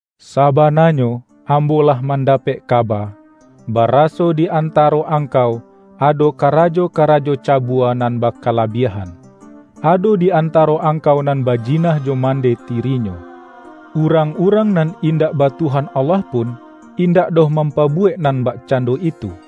Sabananyo ambo lah mandapek kaba, baraso di antaro angkau ado karajo-karajo cabua nan bakalabiah-an: Ado di antaro angkau nan bajina jo mandeh tirinyo. Urang-urang nan indak ba Tuhan Allah pun, indak doh mampabuwek nan bakcando itu!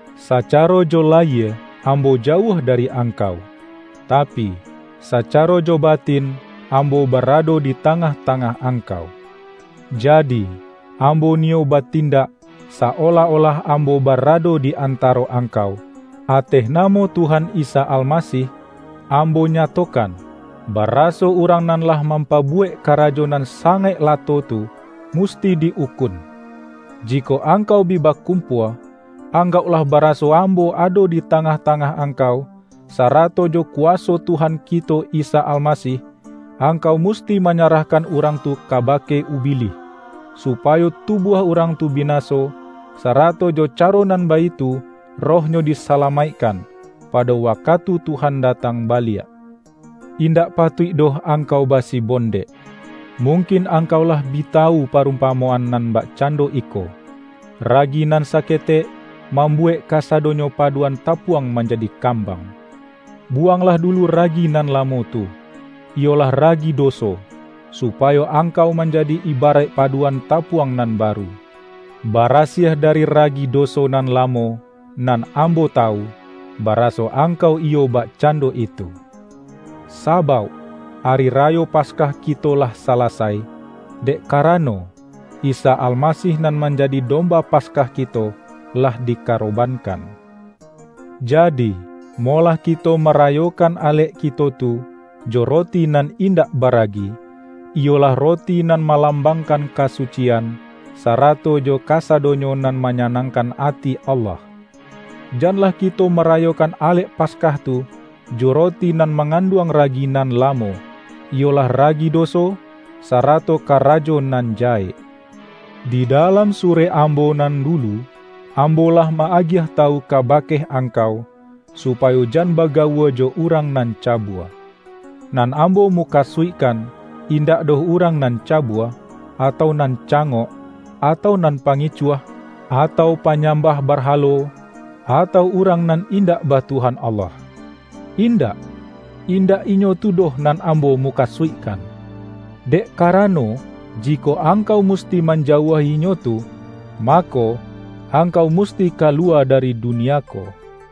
Sacaro jo layie ambo jauah dari angkau, tapi, sacaro jo batin ambo barado di tangah-tangah angkau. Ja-di, ambo niyo batindak, sa-olah-olah ambo barado di antaro angkau, ’Ateh namo Tuhan Isa Almasih, ambo nyato-kan, baraso urang nan lah mampabu-wek karajo nan sangaik lato tu, musti di-ukun!” Jikok angkau bi bakumpua, anggauklah baraso ambo ado di ta-ngah-tangah angkau, sarato jo kuwa-so Tuhan kito Isa Almasih, angkau musti manyarahkan urang tu kabake Ubilih, supayo tubuah urang tu bina-so, sarato jo caro nan baitu rohnyo di-salamaikkan, pado wakatu Tuhan da-tang baliak. Indak patuik doh angkau basibon-dek. Mungkin angkau lah bi tawu pa-rumpamoan nan bakcando iko,”Ragi nan saketek, mambuwek kasadonyo paduan tapuang manjadi kambang!” Buwanglah dulu ragi nan lamo tu, iyolah ragi doso, supayo angkau man-jadi ibaraik paduan tapuang nan ba-ru, barasiah dari ragi doso nan lamo, nan ambo tawu, baraso angkau iyo bakcando itu. Sabauk, Ari Rayo Pas-kah kito lah salasai, dek karano, Isa Almasih nan manjadi domba Paskah kito, lah dikarobankan. Jadi, molah kito marayokan alek kito tu, jo roti nan indak baragi, iyolah roti nan ma-lambangkan kasucian, sarato jo kasa-donyo nan manyanangkan ati Allah. Janlah kito marayokan alek Paskah tu, jo roti nan manganduang ragi nan lamo, iyolah ragi doso, sarato karajo nan jahek. Di dalam surek ambo nan dulu, am-bo lah ma-agiah tawu kabake angkau, supayo jan bagawua jo urang nan ca-bua. Nan ambo mukasuikkan indak doh urang nan cabua, atau nan cangok, atau nan pangicuah, atau panyambah barhalo, atau urang nan indak ba Tuhan Allah. Indak! Indak inyo tu doh nan ambo mukasuikkan; dek karano, jikok angkau musti manjauahi inyo tu, ma-ko, angkau musti kaluwa dari dunia ko.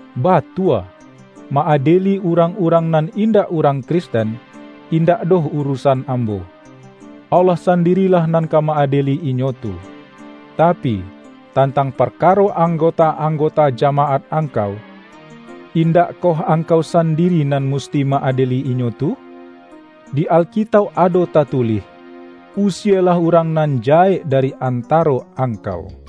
Batua, ma-adieli urang-urang nan indak urang Kristen, indak doh urusan ambo. Allah sandirilah nan ka ma-adieli inyo tu. Tapi, tantang par-karo anggota-anggota jamaat angkau, indakkoh angkau sandiri nan mus-ti ma-adieli inyo tu? Di Alkitauk ado tatulih,”Usielah urang nan jahek da-ri antaro angkau.”